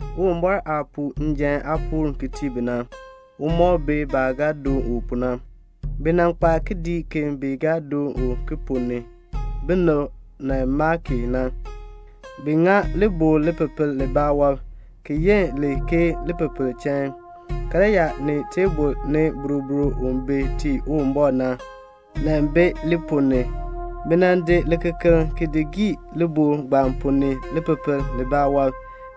Uwumbɔr aah puu njan aapuul ki tii bi na, u mɔk bi baah ga doon u pu na. Bi nan kpa kidiik ki bi ga doon u ki ponn ni, binib nan maa ki na. Bi ŋa libɔkl lipepel libaa wɔb, ki yin li ke lipepel chain. Karyaa ni teebl ni boroboro bi tii Uwumbɔr na, nan bi li ponn ni. Bi di likekeln ki gii libɔkl ponn ni lipepel libaa wɔb,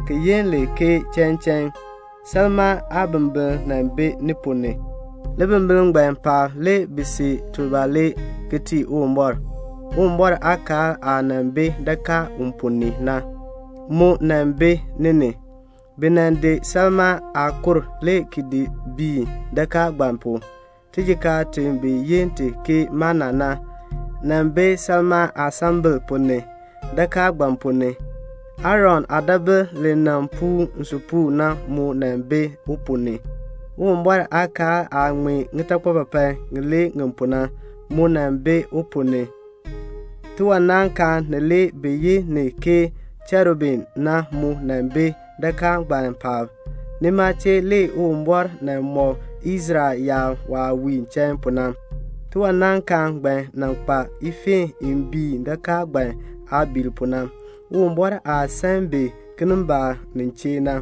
ki yin li ke chain chain. Salmaa aabimbiln nan bi ni ponn ni. Libimbiln ngbaan paab le bi see tubalee ki tii Uwumbɔr. Uwumbɔr aakaal aah nan bi dakaa u ponn ni na, mu nan bi ni ni. Bi nan di salmaa aakur le ki di biin dakaa ngbaan pu. Tijikaar ti bi yi ti ke mana na, nan bi salmaa aasambil ponn ni, dakaa ngbaan ponn ni. Aaron aadaabil li nan puun nsupuun na mu nan bi u ponn ni. Uwumbɔr aakaal aah ŋmee ŋitakpapapan ŋilee ŋi pu na, mu nan bi u ponn ni. Tiwanaankaan nilee bi yi ni ke cherubim na mu nan bi dakaa ngbaan paab. Nima chee le Uwumbɔr nan mɔk Israel yaab waah wiin chain pu na. Tiwanaankaan ngbaan nan kpa ifeen i biin dakaa ngbaan aabiil pu na, Uwumbɔr aah san bi kinimbaak nin chee na.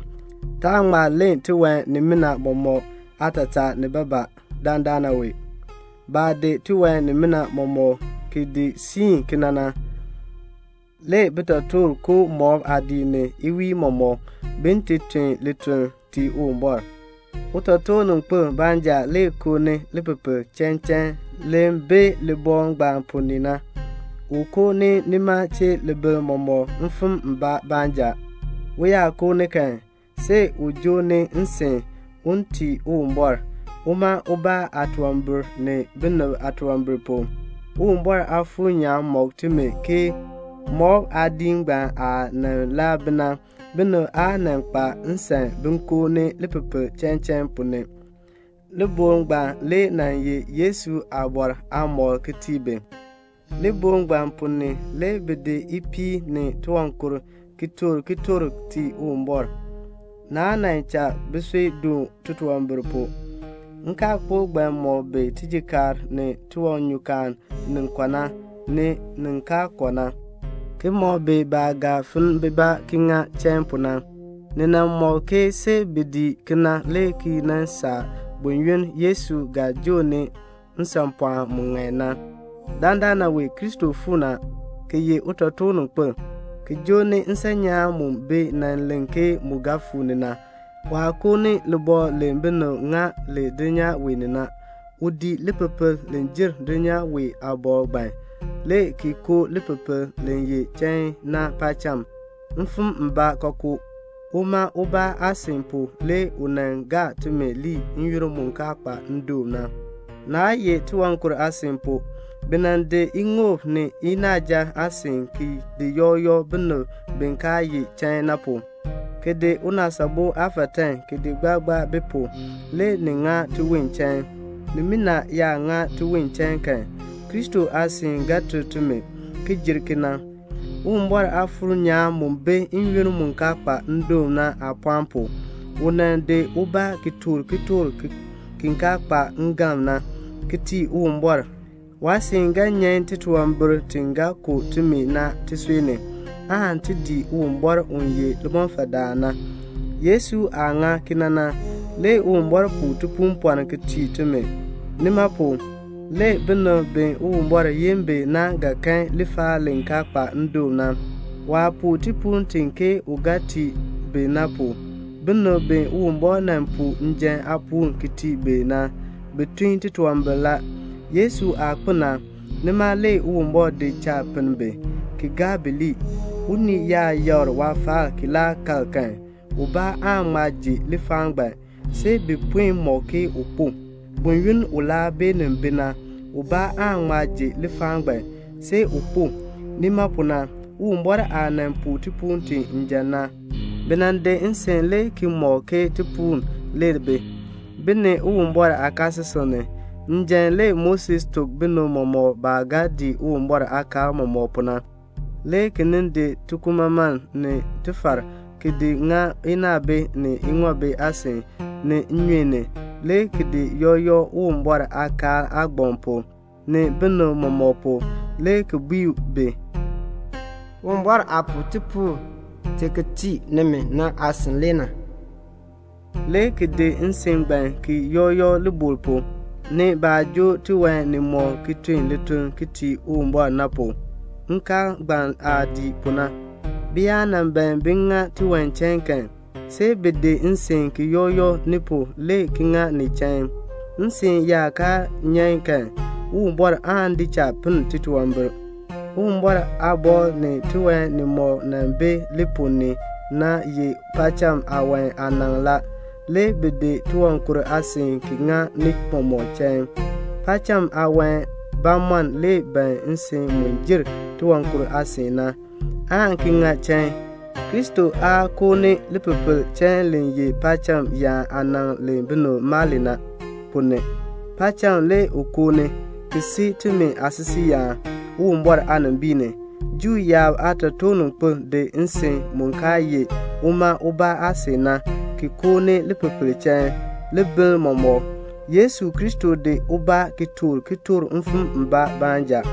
Taan ŋma len tiwan nimina mɔmɔk aatataa nibaa nibaa dandana wee. Baah di tiwan nimina mɔmɔk ki di siin kena na, le bitotoortiib koo mɔb aadiik ni iwiin mɔmɔk, bin ti tun lituln tii Uwumbɔr. Utotoorninkpil baanja le koo ni lipepel chain chain li bi libɔkl ngbaan ponn ni na. U koo ni nima chee libiln mɔmɔk mfim mbaa baanja. U yaa koo ni kan, see u joo ni nsin, un ti tii Uwumbɔr, uma ubaa aatunwambir ni binib aatunwambir pu. Uwumbɔr Aafuur nyaan mɔk timi ke mɔb aadiik ngbaan aah nan laa bi na, binib aa nan kpa nsan bin koo ni lipepel chain chain ponn ni. Libɔkl ngbaan le nan ye Yesu aabɔr aamɔkl ki tii bi. Libɔkl ngbaan ponn ni, le bi di ipiin ni tiwankur ki toor kitork ki tii Uwumbɔr. Naa nan cha bisui doon titunwambir pu. Nkaalkpok ngbaan mɔk bi tijikaar ni tiwanyukaan ni kɔ na, ni nin kaa kɔ na, ki mɔk bi baah ga finn bibaa ki ŋa chain pu na. See bi dii kena ki nan saa buyoonn Yesu aah joo ni nsanpɔɔn mu ŋan na. Dandana wee Kristo fuu ni a, ki ye utotoorninkpil, ki joo ni nsan nyaan mu bi nan len ke mu ga fuu ni na. Waa koo ni libɔkl li binib ŋa li dulnyaa wee ni. U dii lipepel li jer dulnyaa wee aabɔkl ngbaan, le ki koo lipepel li ye chain na paacham, mfim mbaa kookoo. Uma ubaa aasin pu le u nan gaa timi lii n-yoonn mu kaa kpa ndoon na, naa ye tiwankur aasin pu. Bi nan di iŋoob ni inaaja aasin ki di yɔk yɔk binib bi kaa ye chain na pu, ki di unaasabo aafatan ki di gbaa gbaa bi pu. Le ni ŋa tiwon chain. Nimina yaa ŋa tiwon chain kan, Kristo aasin ga ter timi, ki jer kena. Uwumbɔr Aafuur nyaan mu bi n-yoonn mu kaa kpa ndoon na aapɔɔn pu, u nan di ubaa ki toor kitork ki kaa kpa ngalm na, ki tii Uwumbɔr. Waasin ga nyan titunwambir ti ga ku timi na tisui ni, aan ti dii Uwumbɔr u ye limɔfaldaan na. Yesu aah ŋa kena na, le Uwumbɔr puu tipuupɔln ki tii timi. Nima pu, le binib bi Uwumbɔr yin bi na ga kan lifaal li kaa kpa ndoon na, waah puu tipuul ti ke u ga tii bi na. Binib bi Uwumbɔr nan puu njan aapuul ki tii bi na, bi tun titunwambir la. Yesu aah kpo na, nima le Uwumbɔr di cha pinn bi, ki gaa bi lii. Unii yaa yakr waafaal ki laa kal kan, ubaa aan ŋma ji lifaal ngbaan, see bi puen mɔk ke u kpo. Buyoonn u laa beenin bi na, ubaa aan ŋma ji lifaal ngbaan, see u kpo. Nima pu na, Uwumbɔr aah nan puu tipuul ti njan na, bi nan di nsin le ki mɔk ke tipuul le bi, bi ni Uwumbɔr aakaasisik ni. Njan le Moses tuk binib mɔmɔk baah ga dii Uwumbɔr aakaal mɔmɔk pu na, le ki nin di tikumaman ni tifar, ki di ŋa inaabi ni iŋoob aasin, ni nnyun ni, le ki di yɔk yɔk Uwumbɔr aakaal aagbaŋ pu, ni binib mɔmɔk pu, le ki bui bi, "Uwumbɔr aah puu tipuul ti ki tii nimi na aasin le na," le ki di nsin ngbaan ki yɔk yɔk libɔkl pu, ni baah joo tiwan nimɔk ki tun lituln ki tii Uwumbɔr na pu. Nkaal ngbaan aah dii pu na, bi yaa nan ban bin ŋa tiwan chain kan, see bi di nsin ki yɔk yɔk ni pu le ki ŋa ni chain. Nsin yaa kaa nyan kan, Uwumbɔr aan di cha pinn titunwambir. Uwumbɔr aabɔkl ni tiwan nimɔk nan bi li ponn ni na ye paacham aawan aanaŋ la. Le bi di tiwankur aasin ki ŋa ni mɔmɔk chain. Paacham aawan bamɔnn le ban nsin mu jer tiwankur aasin na, aan ki ŋa chain. Kristo aa koo ni lipepel chain li ye paacham yaan aanaŋ li binib maa li na, ponn ni. Paacham le u koo ni, ki si timi aasisiiyaan Uwumbɔr aanimbiin ni. Juu yaab aatotoorninkpil di nsin mu kaa ye uma ubaa aasin na, ki koo ni lipepel chain libiln mɔmɔk. Yesu Kristo di ubaa ki toor kitork mfim mbaa baanja.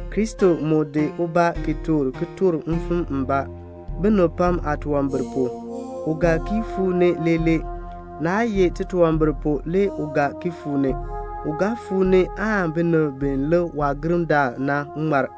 Kristo mu di ubaa ki toor kitork mfim mbaa, binib pam aatunwambir pu. U ga ki fuu ni leelee. Naa ye titunwambir pu le u ga ki fuu ni. U ga fuu ni aan binib bi lik waagirndaal na ŋmar.